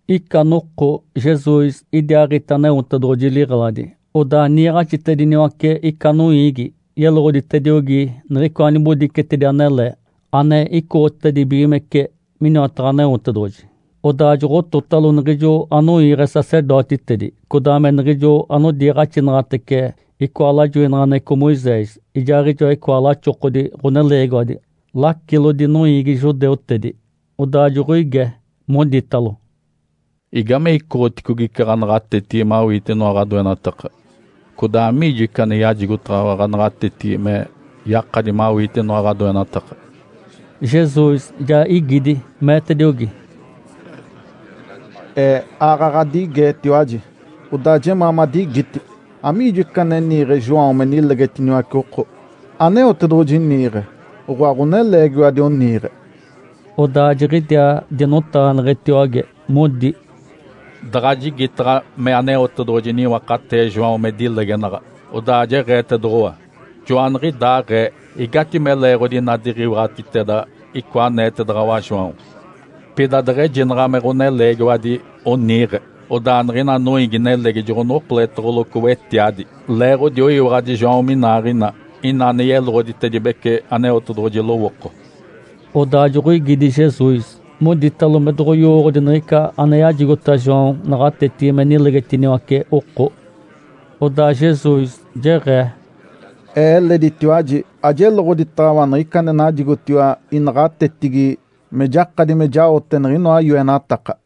Ica noko Jesus idiaaɡ̶ite Aneotedoɡ̶oji liɡ̶eladi, odaa niiɡ̶axitediniwace ica noiigi, yeloɡ̶oditediogi niɡ̶icoa nibodicetedi anele ane icoɡ̶otedibigimece miniwataɡ̶a Aneotedoɡ̶oji. Odaa joɡ̶ototalo niɡ̶ijo anoiiɡ̶e sacerdotitedi, codaa me niɡ̶ijo anodiiɡ̶axinaɡ̶atece icoa lajoinaɡ̶aneɡ̶eco Moisés, ijaaɡ̶ijoa icoa laxokodi ɡ̶oneleegiwadi, lacilodi noiigi judeutedi. Odaa joɡ̶oige, moditalo, “Igame icoɡ̶oticogi ica ɡ̶anaɡ̶atetigi mawiite inoa ɡ̶adoenataka? Codaa amiijo ica ane yajigotaɡ̶awa ɡ̶anaɡ̶atetigi me yakadi mawiite inoa ɡ̶adoenataka?” Jesus ja igidi, meetediogi, “Ee aaɡ̶aɡ̶a ɡ̶adigeetiwaji, odaa jemaa madigiti. Amiijo ica ane niiɡ̶e João me nilegetiniwace oko? Aneotedoɡ̶oji niiɡ̶e? Oɡ̶oa, ɡ̶oneleegiwadi oniiɡ̶e?” Odaa jiɡ̶idiaa dinotaɡ̶aneɡ̶etiwage, modi, “Daɡ̶a jigitaɡ̶a me Aneotedoɡ̶oji niwakatee João me dilegenaɡ̶a, odaa jeɡ̶eetedoɡ̶owa, ‘Joaniɡ̶idaaɡ̶ee igatime leeɡ̶odi ina diɡ̶iwaɡ̶atiteda icoa aneetedaɡ̶awa João?’ Pida deɡ̶ejinaɡ̶a me ɡ̶oneleegiwadi oniiɡ̶e, odaa niɡ̶ina noiigi-nelegi joɡ̶onokoletoɡ̶oloco wetiadi, leeɡ̶odi oyiwaɡ̶adi João minaaɡ̶ina ina ane yeloɡ̶oditedibece Aneotedoɡ̶oji lowooko.” Odaa joɡ̶oigidi Jesus, moditalo me doɡ̶oyowooɡ̶odi niɡ̶ica ane yajigota João naɡ̶atetigi me nilegetiniwace oko. Odaa Jesus jeɡ̶ee, “Ee eleditiwaji ajeloɡ̶oditaɡ̶awa niɡ̶ica ane najigotiwa inaɡ̶atetigi me jakadi me jaote niɡ̶inoa yoenataka.”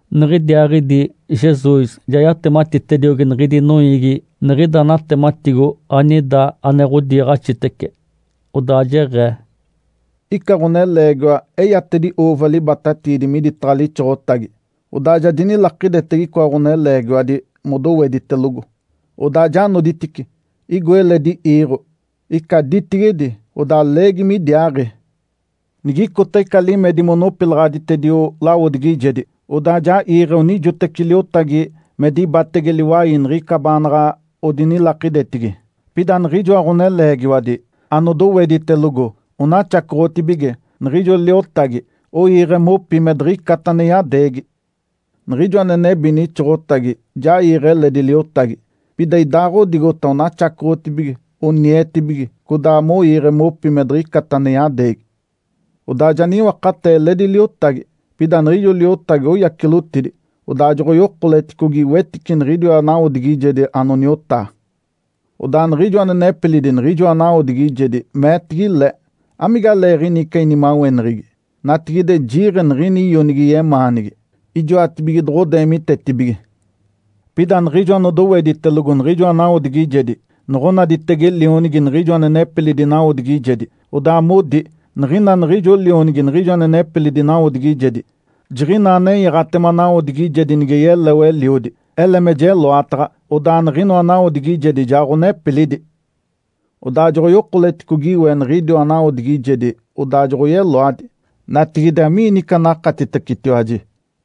Niɡ̶idiaaɡ̶idi Jesus ja yatematitediogi niɡ̶idi noiigi niɡ̶ida natematigo anida ane ɡ̶odiiɡ̶axitece, odaa jeɡ̶ee, “Ica ɡ̶oneleegiwa eyatedi ‘uuva’ libatatiidi miditaɡ̶a lixoɡ̶otagi. Odaa ja dinilakidetege icoa ɡ̶oneleegiwadi modoweditelogo, odaa ja noditice, igo eledi iiɡ̶o, ica ditigedi, odaa leegi midiaaɡ̶i. Niɡ̶icota ica limedi monopilaɡ̶aditedio lawodigijedi, odaa ja iiɡ̶e onijoteci liotagi me dibatege liwai niɡ̶ica baanaɡ̶a odinilakidetigi. Pida niɡ̶ijoa ɡ̶oneleegiwadi anodoweditelogo onaxacoɡ̶otibige niɡ̶ijo liotagi, oiiɡ̶e mopi, me diɡ̶icata ane yadeegi. Niɡ̶ijo ane nebi nixoɡ̶otagi ja iiɡ̶e eledi liotagi. Pida idaaɡ̶odigota onaxacoɡ̶otibige, onietibige, codaa moiiɡ̶e mopi me diɡ̶icata ane yadeegi. Odaa ja niwakatee eledi liotagi. Pida niɡ̶ijo liotagi oyacilotidi, odaa joɡ̶oyokoleticogi wetice niɡ̶idiwa nawodigijedi anoniotaa. Odaa niɡ̶ijo ane nepilidi niɡ̶ijoa nawodigijedi meetigi le, ‘Amigaleeɡ̶ini ica inimaweneɡ̶egi? Natigide jiiɡ̶e niɡ̶ini ionigi yemaanigi. Ijoatibige doɡ̶odeemitetibige.’ Pida niɡ̶ijo anodoweditelogo niɡ̶ijoa nawodigijedi noɡ̶onaditege lionigi niɡ̶ijo ane nepilidi nawodigijedi, odaa modi, ‘Niɡ̶ina niɡ̶ijo lionigi niɡ̶ijo ane nepilidi nawodigijedi, jiɡ̶inaa nenyaɡ̶atema nawodigijedi, nige yeleo eliodi. Ele me jeloataɡ̶a, odaa niɡ̶inoa nawodigijedi ja ɡ̶onepilidi.’ Odaa joɡ̶oyokoleticogi we niɡ̶idiwa nawodigijedi, odaa joɡ̶oyeloadi. Natigide, amiini ica anakatitecetiwaji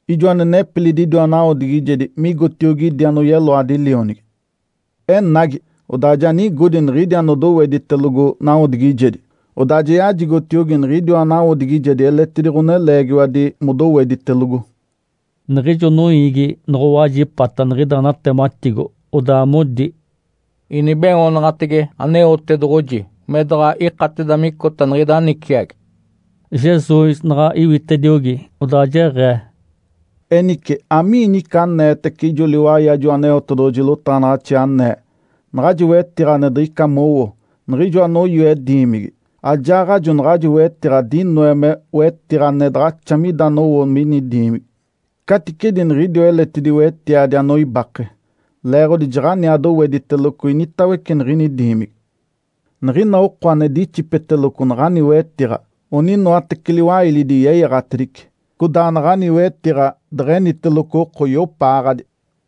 ijo ane nepilidi idiwa nawodigijedi migotiogi idi anoyeloadi lionigi? Enagi, odaa ja nigodi niɡ̶idi anodoweditelogo nawodigijedi. Odaa ja yajigotiogi niɡ̶idiwa nawodigijedi eletidi ɡ̶oneleegiwadi modoweditelogo.” Niɡ̶ijo noiigi noɡ̶owajipata niɡ̶ida natematigo, odaa modi, “Inibeoonaɡ̶atege Aneotedoɡ̶oji me daɡ̶a ikateda micota niɡ̶ida niciagi.” Jesus naɡ̶a iwitediogi, odaa jeɡ̶ee, “Enice, amiini ica aneetece ijo liwai ajo Aneotedoɡ̶oji lotaɡ̶anaɡ̶axi anee, ‘Naɡ̶ajo wetiɡ̶a ane diɡ̶ica mowo, niɡ̶ijo anoyoe diimigi, ajaaɡ̶ajo naɡ̶ajo wetiɡ̶a dinoe me wetiɡ̶a ane daɡ̶axa mida anowo mini diimigi, caticedi niɡ̶idiwa eletidi wetiadi anoibake’? (Leeɡ̶odi jaɡ̶aniaa dowediteloco initawece niɡ̶ini diimigi.) Niɡ̶ina oko ane dixipeteloco naɡ̶ani wetiɡ̶a, oninoateci liwailidi yeyaɡ̶atedice. Codaa naɡ̶ani wetiɡ̶a deɡ̶eniteloco oko, iopaaɡ̶adi.”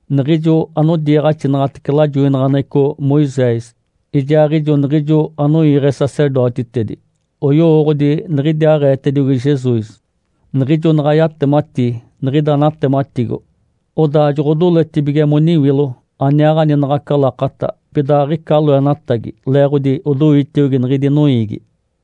Niɡ̶ijo anodiiɡ̶axinaɡ̶atece lajoinaɡ̶aneɡ̶eco Moisés ijaaɡ̶ijo niɡ̶ijo anoiiɡ̶e sacerdotitedi, oyowooɡ̶odi niɡ̶idiaaɡ̶eetediogi Jesus, niɡ̶ijo naɡ̶a yatemati niɡ̶ida natematigo. Odaa joɡ̶odoletibige moniwilo aniaaɡ̶ani naɡ̶aca lakata, pida aɡ̶ica loenatagi leeɡ̶odi odoitiogi niɡ̶idi noiigi.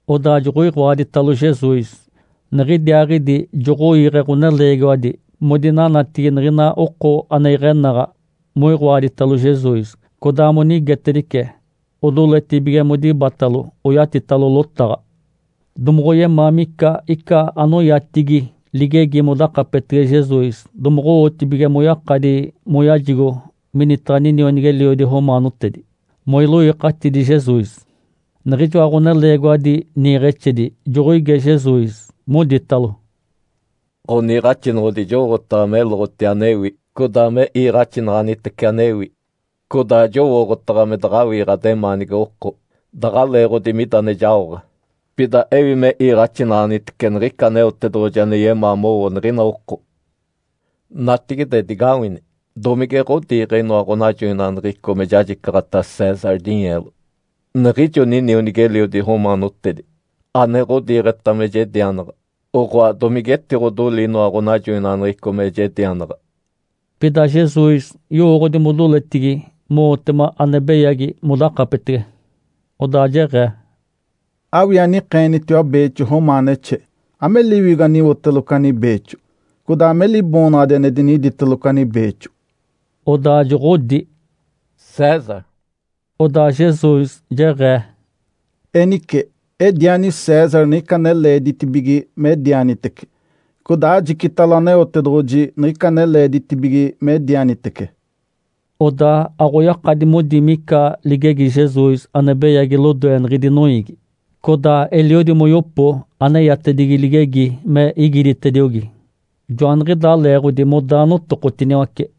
Odaa joɡ̶oiɡ̶oaditalo Jesus, niɡ̶idiaaɡ̶idi joɡ̶oiiɡ̶e ɡ̶oneleegiwadi modinanatigi niɡ̶ina oko ane iɡ̶enaɡ̶a moiɡ̶oaditalo Jesus, codaa monigetedice, odoletibige modibatalo oyatitalo lotaɡ̶a. Domoɡ̶oyemaa mica ica anoyatigi ligegi modakapetege Jesus, domoɡ̶owotibige moyakadi moyajigo minitaɡ̶a ninionigi-eliodi romaanotedi, moiloikatidi Jesus. Niɡ̶ijoa ɡ̶oneleegiwadi niiɡ̶exedi joɡ̶oige Jesus, moditalo, “Ǥoniiɡ̶axinoɡ̶odi, jowooɡ̶otaɡ̶a meloɡ̶oti anewi, codaa me iiɡ̶axinaɡ̶anitece anewi. Codaa jowooɡ̶otaɡ̶a me daɡ̶awii ɡ̶ademaani oko daɡ̶a leeɡ̶odi mida ane jaoɡ̶a. Pida ewi me iiɡ̶axinaɡ̶anitece niɡ̶ica Aneotedoɡ̶oji ane yemaa mowo niɡ̶ina oko. Natigide digawini, domige ɡ̶odiiɡ̶e inoa ɡ̶onajoinaɡ̶aneɡ̶eco me jajicaɡ̶ata César dinyeelo, niɡ̶ijo ninionigi-eliodi romaanotedi ane ɡ̶odiiɡ̶eta me jedianaɡ̶a? Oɡ̶oa, domige etiɡ̶odoli inoa ɡ̶onajoinaɡ̶aneɡ̶eco me jedianaɡ̶a?” Pida Jesus yowooɡ̶odi modoletigi mowotema ane beyagi modakapetege. Odaa jeɡ̶ee, “Awii anikeenitiwa beexo romaanexe. Ame liwigo aniwoteloco ani beexo, codaa ame liboonaɡ̶adi ane diniditeloco ani beexo?” Odaa joɡ̶odi, “César.” Odaa Jesus jeɡ̶ee, “Enice, ediani César niɡ̶ica ane leeditibige medianitece, codaa ajicitalo Aneotedoɡ̶oji niɡ̶ica ane leeditibige medianitece.” Odaa aɡ̶oyakadi modi mica ligegi Jesus ane beyagi lodoe niɡ̶idi noiigi. Codaa eliodi moyopo ane eyatedigi ligegi me igiditediogi. Joaniɡ̶idaa leeɡ̶odi modaa notokotiniwace.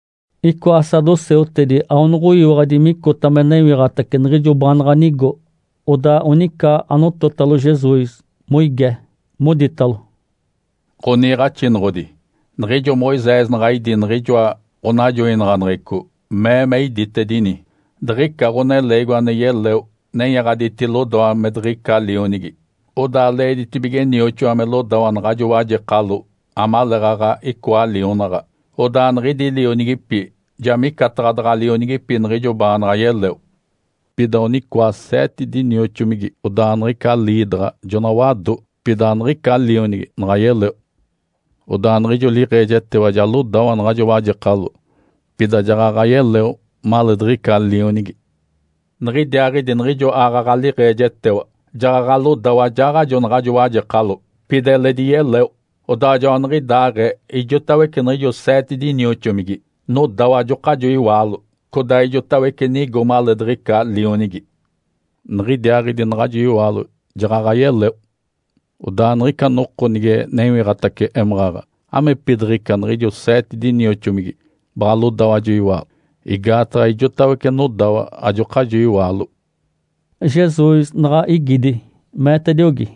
Icoa saduceutedi aonoɡ̶oyiwaɡ̶adi micota me newiɡ̶atace niɡ̶ijo baanaɡ̶a nigo, odaa onica anototalo Jesus, moige, Moditalo, “Ǥoniiɡ̶axinoɡ̶odi, niɡ̶ijo Moisés naɡ̶a idí niɡ̶ijoa ɡ̶onajoinaɡ̶aneɡ̶eco, mee me iditedini, ‘Diɡ̶ica ɡ̶oneleegiwa ane yeleo nenyaɡ̶aditi lodawa me diɡ̶ica lionigi, odaa leeditibige nioxoa me lodawa naɡ̶ajo wajekalo amaleeɡ̶aɡ̶a icoa lionaɡ̶a. Odaa niɡ̶idi lionigipi ja micataɡ̶a daɡ̶a lionigipi niɡ̶ijo baanaɡ̶a yeleo.’ Pida onicoa seete dinioxomigi. Odaa niɡ̶ica liidaɡ̶a jona wado. Pida aniɡ̶ica lionigi naɡ̶a yeleo. Odaa niɡ̶ijo liiɡ̶ejetewa ja lodawa naɡ̶ajo wajekalo. Pida jaɡ̶aɡ̶a yeleo maleediɡ̶ica lionigi. Niɡ̶idiaaɡ̶idi niɡ̶ijo aaɡ̶aɡ̶a liiɡ̶ejetewa jaɡ̶aɡ̶a lodawa ajaaɡ̶ajo naɡ̶ajo wajekalo. Pida eledi yeleo. Odaa joaniɡ̶idaaɡ̶ee ijotawece niɡ̶ijo seete dinioxomigi nodawa ajokajo iwaalo, codaa ijotawece nigo maleediɡ̶ica lionigi. Niɡ̶idiaaɡ̶idi naɡ̶ajo iwaalo jaɡ̶aɡ̶a yeleo. Odaa niɡ̶ica noko nige newiɡ̶atace émaɡ̶aɡ̶a, amigepidiɡ̶ica niɡ̶ijo seete dinioxomigi baɡ̶a lodawa ajo iwaalo? Igaataɡ̶a ijotawece nodawa ajokajo iwaalo.” Jesus naɡ̶a igidi, meetediogi,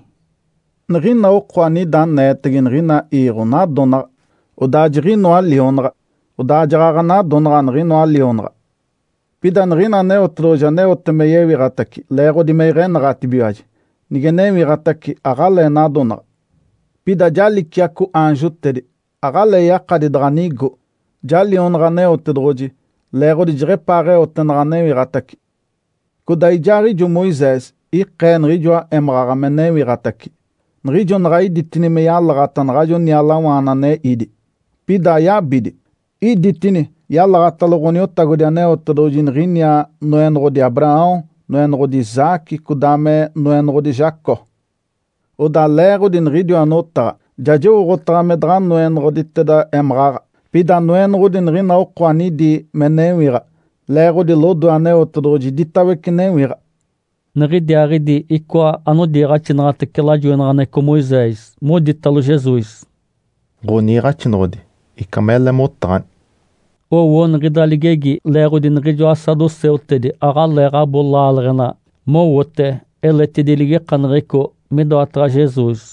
“Niɡ̶ina oko anida aneetege niɡ̶ina iiɡ̶o nadonaɡ̶a, odaa jiɡ̶inoa lionaɡ̶a, odaa jaɡ̶aɡ̶a nadonaɡ̶a niɡ̶inoa lionaɡ̶a. Pida niɡ̶ina Aneotedoɡ̶oji aneote me yewiɡ̶atace leeɡ̶odi me iɡ̶enaɡ̶atibigiwaji, nige newiɡ̶atace, aɡ̶alee nadonaɡ̶a. Pida ja liciaco aanjotedi, aɡ̶alee yakadi daɡ̶a nigo. Ja lionaɡ̶a Aneotedoɡ̶oji leeɡ̶odi jeɡ̶epaaɡ̶eote naɡ̶a newiɡ̶atace. Codaa ijaaɡ̶ijo Moisés ikee niɡ̶ijoa émaɡ̶aɡ̶a me newiɡ̶atace. Niɡ̶ijo naɡ̶a iditini me yalaɡ̶ata naɡ̶ajo nialawaana ane ídi, pida ayabidi. Iditini yalaɡ̶atalo Ǥoniotagodi Aneotedoɡ̶oji niɡ̶iniaa, ‘Noenoɡ̶odi Abraão, Noenoɡ̶odi Isaque, codaa me Noenoɡ̶odi Jacó.’ Odaa leeɡ̶odi niɡ̶idiwa notaɡ̶a, ja jowooɡ̶otaɡ̶a me daɡ̶a Noenoɡ̶oditeda émaɡ̶aɡ̶a, pida Noenoɡ̶odi niɡ̶ina oko anidi me newiɡ̶a. Leeɡ̶odi lodoe Aneotedoɡ̶oji iditawece newiɡ̶a.” Niɡ̶idiaaɡ̶idi icoa anodiiɡ̶axinaɡ̶atece lajoinaɡ̶aneɡ̶eco Moisés moditalo Jesus, “Ǥoniiɡ̶axinoɡ̶odi, ica mele motaɡ̶ani!” Owo niɡ̶ida ligegi leeɡ̶odi niɡ̶ijoa saduceutedi aɡ̶aleeɡ̶abo laaleɡ̶ena mowote eletidi ligikaneɡ̶eco midoataɡ̶a Jesus.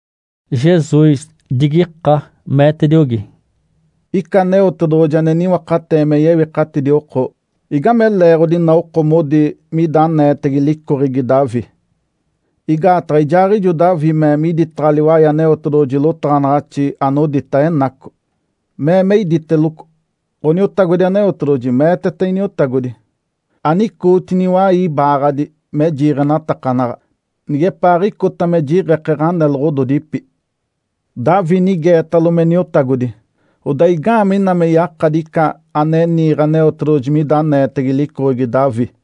Jesus digika, meetediogi, “Ica Aneotedoɡ̶oji ane niwakatee me yewikatidi oko, igame leeɡ̶odi ina oko modi mida aneetege licoɡ̶egi Davi? Igaataɡ̶a ijaaɡ̶ijo Davi mee miditaɡ̶a liwai Aneotedoɡ̶oji lotaɡ̶anaɡ̶axi anodita Enaco, mee me iditeloco, ‘Ǥoniotagodi Aneotedoɡ̶oji meeteta Iniotagodi, “Anicootini iwai ibaaɡ̶adi me jiiɡ̶enatakanaɡ̶a, nigepaaɡ̶icota me jiɡ̶eke ɡ̶aneloɡ̶ododipi.” ’ Davi nigeetalo me Niotagodi, odaa igaamee ina me yakadi ica ane niiɡ̶e Aneotedoɡ̶oji mida aneetege licoɡ̶egi Davi?”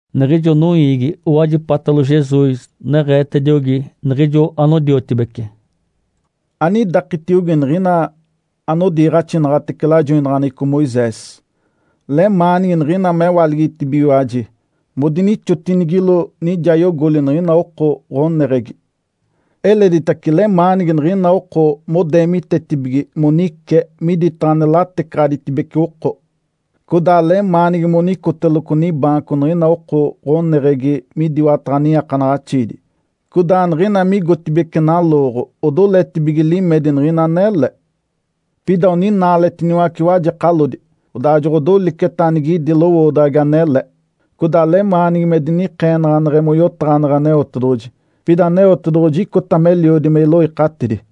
Niɡ̶ijo noiigi owajipatalo Jesus, neɡ̶eetediogi niɡ̶ijo anodiotibece, “Anidakitiogi niɡ̶ina anodiiɡ̶axinaɡ̶atece lajoinaɡ̶aneɡ̶eco Moisés. Lemaanigi niɡ̶ina mewaligitibigiwaji, modinixotinigilo nijayogoli niɡ̶ina oko ɡ̶oneɡ̶egi. Eleditace lemaanigi niɡ̶ina oko modeemitetibige monice miditaɡ̶a ane latecaɡ̶aditibece oko. Codaa lemaanigi monicoteloco nibaanco niɡ̶ina oko ɡ̶oneɡ̶egi midiwataɡ̶a niiakanaɡ̶axiidi, codaa niɡ̶ina migotibeci nalooɡ̶o, odoletibige limedi niɡ̶ina anele. Pida oninaaletiniwace wajekalodi, odaa joɡ̶odoliceta anigidi lowoodaɡ̶agi anele, codaa lemaanigi me dinikeenaɡ̶aneɡ̶e moyotaɡ̶aneɡ̶e Aneotedoɡ̶oji. Pida Aneotedoɡ̶oji icota meliodi me iloikatidi.”